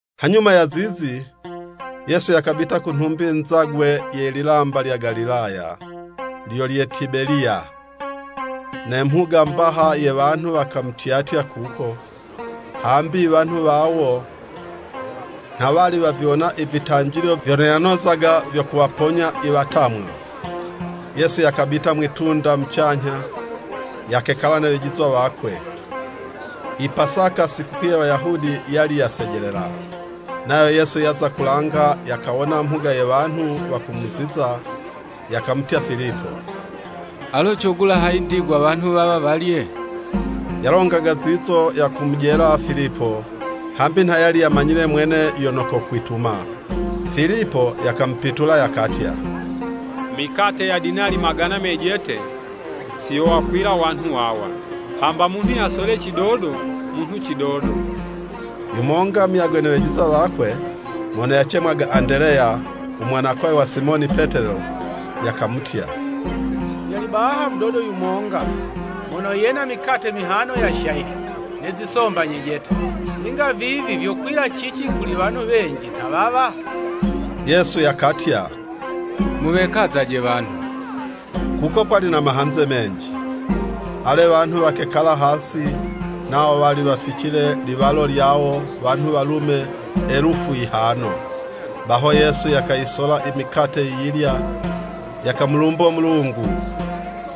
Hanyuma ya zizi, Yesu yakabita ku nhumbi nzagwe ye lilamba lya Galilaya, (lyo lye Tibeliya). Ne mhuga mbaha ye wanhu wakamutyatya kuko, hambi iwanhu wawo nha wali waviwona ivitanjilo vyono yanozaga vyo kuwaponya i watamwa. Yesu yakabita mwi'tunda mucanyha, yakekala ne wejizwa wakwe. I Pasaka, sikukuu ye Wayahudi yali yasejelela. Nayo Yesu yaza kulanga, yakawona mhuga ye wanhu wakumuziza, yakamutya Filipo, “Alo cogula hayi ndigwa wanhu wawa walye?” ( Yalongaga zizo yakumujela Filipo, hambi nha yali yamanyile mwene yono kokwituma.) Filipo yakamupitula yakatya, “Mikate ya dinali magana mejete, si yowakwila wanhu wawa, hamba munhu yasole cidodo munhu cidodo.” Yumonga muyagwe ne wejizwa wakwe, mono yacemwaga Andeleya, u mwanakwawe wa Simoni Petelo, yakamutya. “Yali bahano mudodo yumonga, mono yena mikate mihano ya shayili ne zisomba nyejete; ninga vivi vyokwila cici kuli wanhu wenji nha wawa?” Yesu yakatya, “Muwekazaje wanhu.” Kuko kwali na mahanze menji. Ale, wanhu wakekala hasi, nawo wali waficile liwalo lyawo, wanhu walume Elufu yihano. Baho Yesu yakayisola i mikate yiyilya, yakamulumbo Mulungu,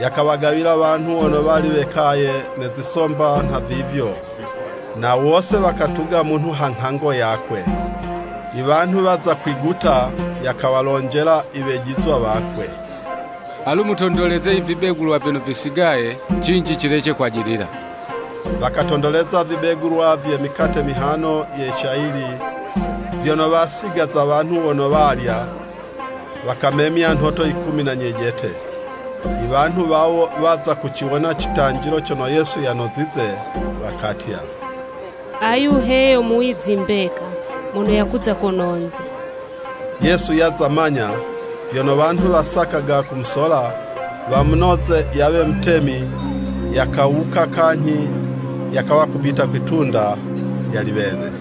yakawagawila wanhu wono wali wekaye, ne zisomba nhavivyo, na wose wakatuga munhu ha nghango yakwe. I wanhu waza kwiguta, yakawalonjela i Wejizwa wakwe, “Alu mutondoleze ivibegulwa vyono visigaye, cinji cilece kwajilila.” Wakatondoleza ivibegulwa vye mikate mihano ye shayili vyono wasigaza wanhu wono walya, wakamemya nhoto ikumi na nyejete. Iwanhu wawo waza kuciwona citanjilo cono Yesu yanozize, wakatya, “Ayu he yo muwizi mbeka, mono yakuza kononze.” Yesu yaza manya vyono wanhu wasakaga kumusola wamunoze yawe mutemi, yakawuka kanyhi, yakawa kubita kwi'tunda, yali wene.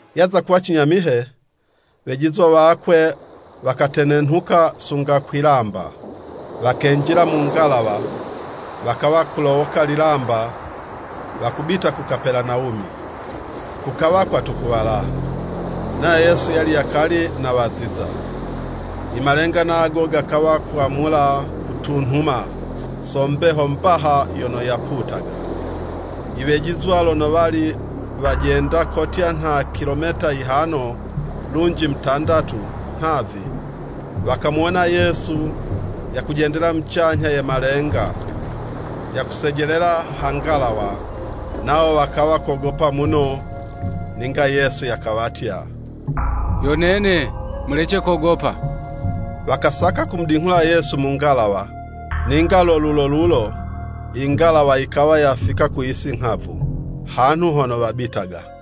Yaza kuwa cinyamihe, wejizwa wakwe wakatenenhuka sunga kwi'lamba, wakenjila mu ngalawa, wakawa kulowoka lilamba wakubita ku Kapelanawumi. Kukawa kwatukuwala, nayo Yesu yali yakali nawaziza. Imalenga nago gakawa kwamula kutunhuma, so mbeho mbaha yono yaputaga. Iwejizwa lono wali wajenda kotya nha kilometa yihano lunji mutandatu, nhavi, wakamuwona Yesu yakujendela mucanyha ye malenga, yakusejelela ha ngalawa, nawo wakawa kogopa muno. Ninga Yesu yakawatya, “Yo nene, mulece kogopa.” Wakasaka kumudinghula Yesu mu ngalawa, ninga lo lulo lulo, ingalawa yikawa yafika ku yisi nghavu; hanhu hono wabitaga.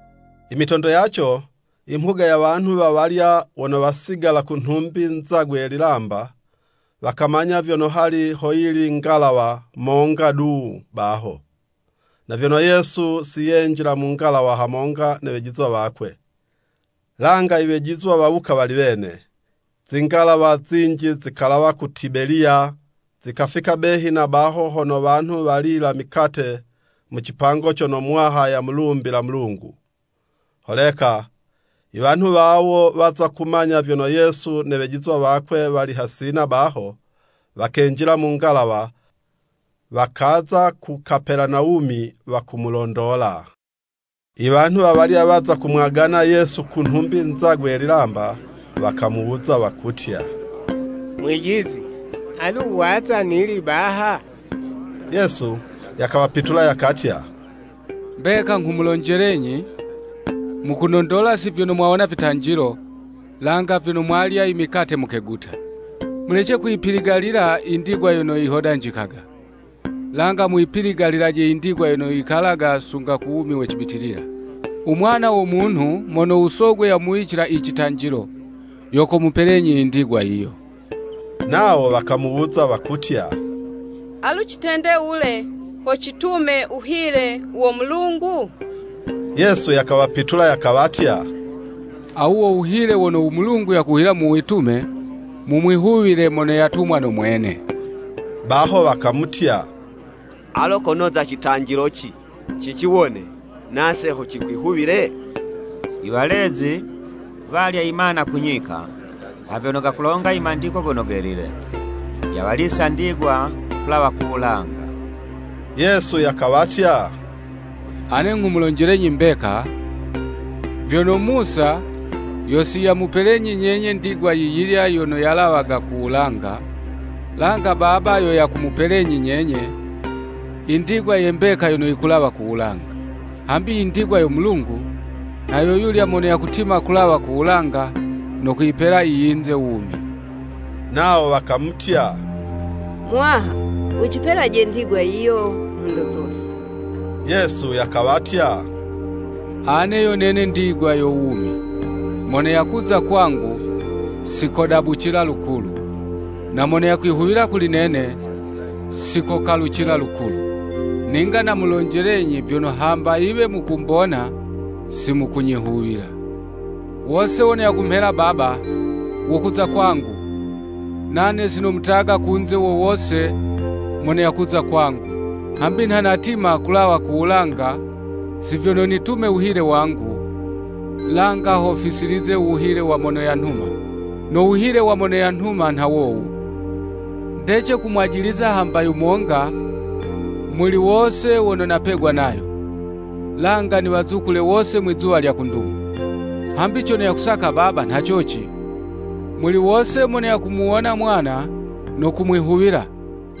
I mitondo yaco, i mhuga ye wanhu wawalya wono wasigala ku nhumbi nzagwe ye lilamba, wakamanya vyono hali hoyili ngalawa monga du baho, na vyono Yesu si yenjila mu ngalawa hamonga ne wejizwa wakwe, langa i wejizwa wawuka wali wene, zingalawa zinji zikalawa ku Tibeliya, zikafika behi na baho hono wanhu walila mikate mu cipango cono Muwaha yamulumbila Mulungu. Holeka i wanhu wawo waza kumanya vyono Yesu ne wejizwa wakwe wali hasina baho, wakenjila mu ngalawa, wakaza ku Kapelanawumi wakumulondola. Iwanhu wawalya waza kumwagana Yesu ku nhumbi nzagwe ye lilamba, wakamuwuza wakutya, “Mwijizi, alu waza nili baha?” Yesu yakawapitula, yakatya, “Mbeka, nghumulonjelenyi, mukunondola, si vyono mwawona vitanjilo, langa vyono mwalya imikate mukeguta. Mulece kuyipiligalila indigwa yono yihodanjikaga, langa muyipiligalilaje indigwa yono yikalaga sunga ku wumi we cibitilila. U Mwana wo Munhu mono u Sogwe yamuwicila i citanjilo, yo komupelenyi indigwa yiyo.” Nawo wakamuwuza wakutya, “Alu citende wule, ho citume u wuhile wo Mulungu?” Yesu yakawapitula yakawatya, “Awu wo wuhile wono u Mulungu yakuhila muwitume, mumwihuwile mono yatumwa no Mwene.” Baho wakamutya, “Alo konoza citanjilo ci, ciciwone, nase ho cikwihuwile?” I walezi walya i mana ku nyika, nha vyono gakulonga i Mandiko Gono Gelile, “Yawalisa ndigwa kulawa ku wulanga.” Yesu yakawatya, “Ane nghumulonjelenyi mbeka, vyono Musa yo si yamupelenyi nyenye ndigwa yiyilya yono yalawaga ku wulanga, langa Baba yo yakumupelenyi nyenye, indigwa ye mbeka yono yikulawa ku wulanga. Hambi indigwa yo Mulungu, nha yo yulya mono yakutima kulawa ku wulanga, no kuyipela iyinze wumi.” Nawo wakamutya, “Muwaha, wucipelaje ndigwa yiyo nhondo zose.” Yesu yakawatya, “Ane yo nene ndigwa yo wumi. Mono yakuza kwangu, si kodabucila lukulu. Na mono yakwihuwila kuli nene, si kokalucila lukulu.” Ninga namulonjelenyi vyono hamba yiwe mukumbona, si mukunyihuwila. Wose wono yakumhela Baba, wokuza kwangu, nane si nomutaga kunze wo wose mono yakuza kwangu. Hambi nha natima kulawa ku wulanga, si vyono nitume wuhile wangu, langa ho fisilize u wuhile wa mono yanhuma. No wuhile wa mono yanhuma nha wowu, “Ndece kumwajiliza hamba yumonga muli wose wono napegwa nayo, langa niwazukule wose mwizuwa lya ku ndumo.” Hambi cono yakusaka Baba nha coci, muli wose mono yakumuwona Mwana, no kumwihuwila,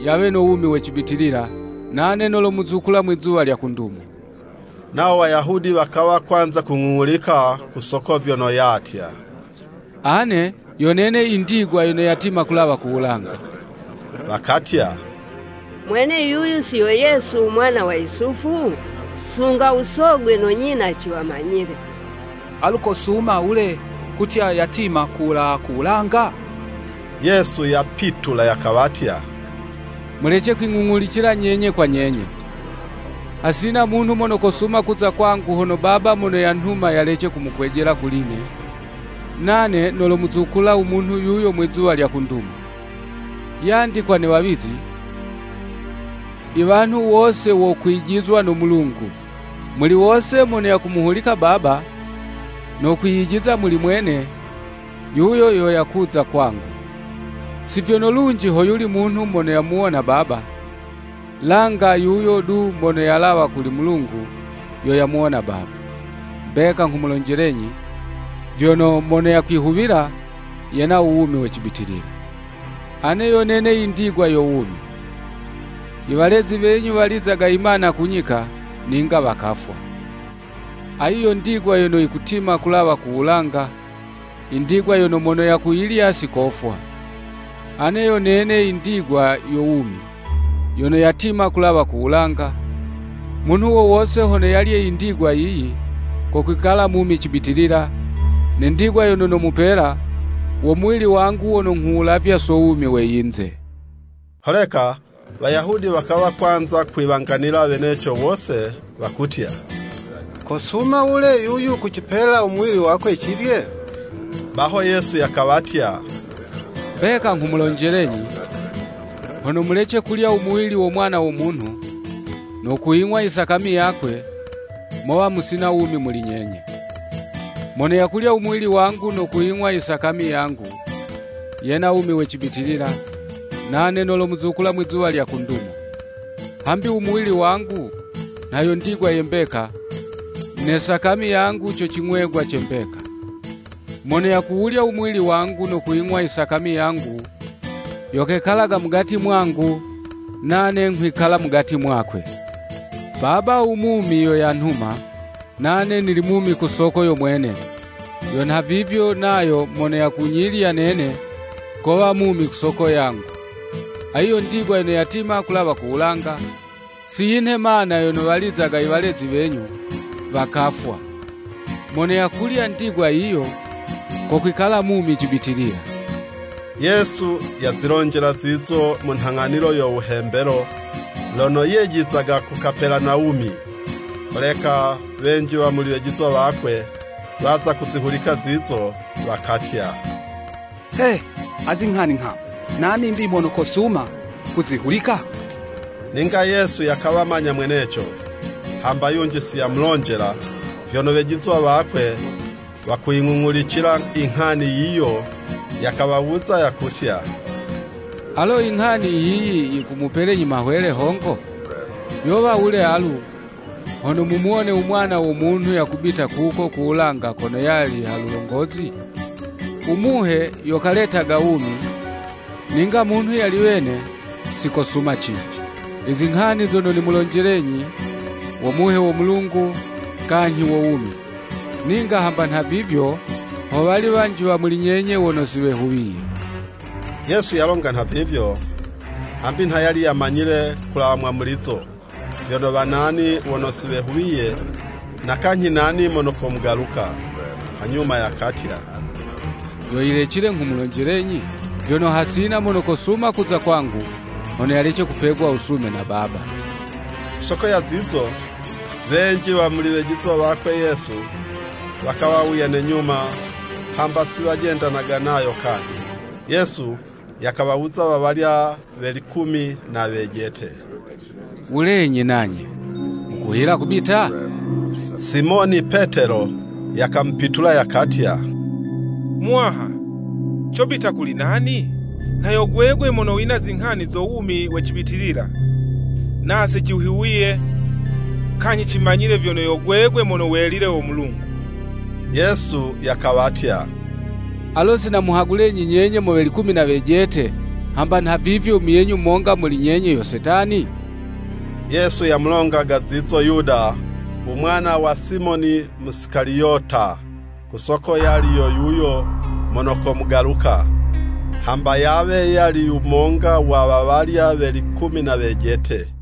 yawe no wumi we cibitilila, nane nolowazukula Mwi'zuwa lya ku ndumo. Nawo Wayahudi wakawa kwanza kung'ung'ulika ku soko vyono yatya, “Ane yo nene i ndigwa yono yatima kulawa ku wulanga.” Wakatya, “Mwene yuyu si yo Yesu u mwana wa Yusufu? Sunga u sogwe no nyina ciwamanyile! Alu kosuma wule kutya yatima kulawa ku wulanga?” Yesu yapitula yakawatya, “Mulece kwing'ung'ulicila nyenye kwa nyenye. Hasina munhu mono kosuma kuza kwangu hono Baba mono yanhuma yalece kumukwejela kuli'ne, nane nolomuzukula u munhu yuyo mwizuwa lya ku ndumo. Yandikwa ne wawizi, ‘Iwanhu wose wokwijizwa no Mulungu.’ Muli wose mono yakumuhulika Baba, no kwiyijiza muli Mwene, yuyo yo yakuza kwangu. Si vyono lunji hoyuli munhu mono yamuwona Baba, langa yuyo du mono yalawa kuli Mulungu, yo yamuwona Baba. Mbeka nghumulonjelenyi, vyono, mono yakwihuwila, yena u wumi we cibitilila. Ane yo nene indigwa yo wumi. I walezi wenyu walizaga imana ku nyika, ninga wakafwa. Ayi yo ndigwa yono yikutima kulawa ku wulanga, indigwa yono mono yakuyilya si kofwa. Ane yo nene indigwa yo wumi, yono yatima kulawa ku wulanga, munhu wo wose hono yalye indigwa yiyi, kokwikala mumi cibitilila, ne ndigwa yono nomupela, wo muwili wangu wono nghuwulavya so wumi we yinze.” Holeka Wayahudi wakawa kwanza kwiwanganila weneco wose, wakutya, “Kosuma wule yuyu kucipela u muwili wakwe cilye?” Baho Yesu yakawatya, “Mbeka nghumulonjelenyi, Hono mulece kulya u muwili wo Mwana wo Munhu, no kuying'wa isakami yakwe, mowa musina wumi muli nyenye. Mono yakulya u muwili wangu no kuying'wa isakami yangu, yena wumi we cibitilila, nane nolomuzukula Mwizuwa lya ku ndumo. Hambi u muwili wangu nha yo ndigwa ye mbeka, ne sakami yangu co cing'wegwa ce mbeka. Mono yakuwulya u muwili wangu no kuying'wa isakami yangu, yo kekalaga mugati mwangu, nane nghwikala mugati mwakwe. Baba u mumi yo yanhuma, nane nili mumi ku soko yo Mwene, yo nhavivyo nayo mono yakunyilya nene kowa mumi ku soko yangu. Ayi yo ndigwa yono yatima kulawa ku wulanga, si yinhe mana yono walizaga i walezi wenyu, wakafwa. Mono yakulya ndigwa yiyo, kokwikala mumi cibitilila.” Yesu yazilonjela zizo mu nhang'anilo yo wuhembelo, lono yejizaga ku Kapelanawumi. Holeka wenji wa muli wejizwa wakwe, waza kuzihulika zizo wakatya, “He, azi nghani nghamu! Nani'mbi mono kosuma kuzihulika?” Ninga Yesu yakawamanya mweneco, hamba yunji si yamulonjela vyono wejizwa wakwe wakuying'ung'ulicila inghani yiyo, yakawawuza yakutya, “Alo inghani yiyi yikumupelenyi mahwele hongo? Yowa wule alu, hono mumuwone u Mwana wo Munhu yakubita kuko ku wulanga kono yali ha lulongozi? U Muhe yo kaletaga wumi, ninga munhu yali wene, sikosuma cinji. Izinghani zono nimulonjelenyi, wo Muhe wo Mulungu, kanyhi wo wumi. Ninga hamba nhavivyo ho wali wanji wa muli nyenye wono si wehuwiye.” (Yesu yalonga nhavivyo, hambi nha yali yamanyile kulawa mwamulizo, vyono wa nani wono si wehuwiye, na kanyhi nani mono komugaluka.) Hanyuma yakatya, “Yo yilecile nghumulonjelenyi, vyono hasina mono kosuma kuza kwangu hono yalece kupegwa wusume na Baba. Kusoko ya zizo, wenji wa muli wejizwa wakwe Yesu, wakawuya ne nyuma, hamba si wajendanaga nayo kanyhi.” Yesu yakawawuza wawalya we likumi na wejete, “Wulenyi nanye, mukuhila kubita?” Simoni Petelo yakamupitula yakatya, “Muwaha, cobita kuli nani? Nha yo gwegwe mono wina zinghani zo wumi we cibitilila. Nase cihuwiye, kanyhi cimanyile, vyono yo gwegwe Mono Welile wo Mulungu.” Yesu yakawatya, “Alo si namuhagulenyi nyenye mo we likumi na wejete, hamba nha vivyo muyenyu monga muli nyenye yo Setani!” Yesu yamulongaga zizo Yuda u mwana wa Simoni Musikaliyota, ku soko yali yo yuyo mono komugaluka, hamba yawe yali yumonga wa wawalya we likumi na wejete.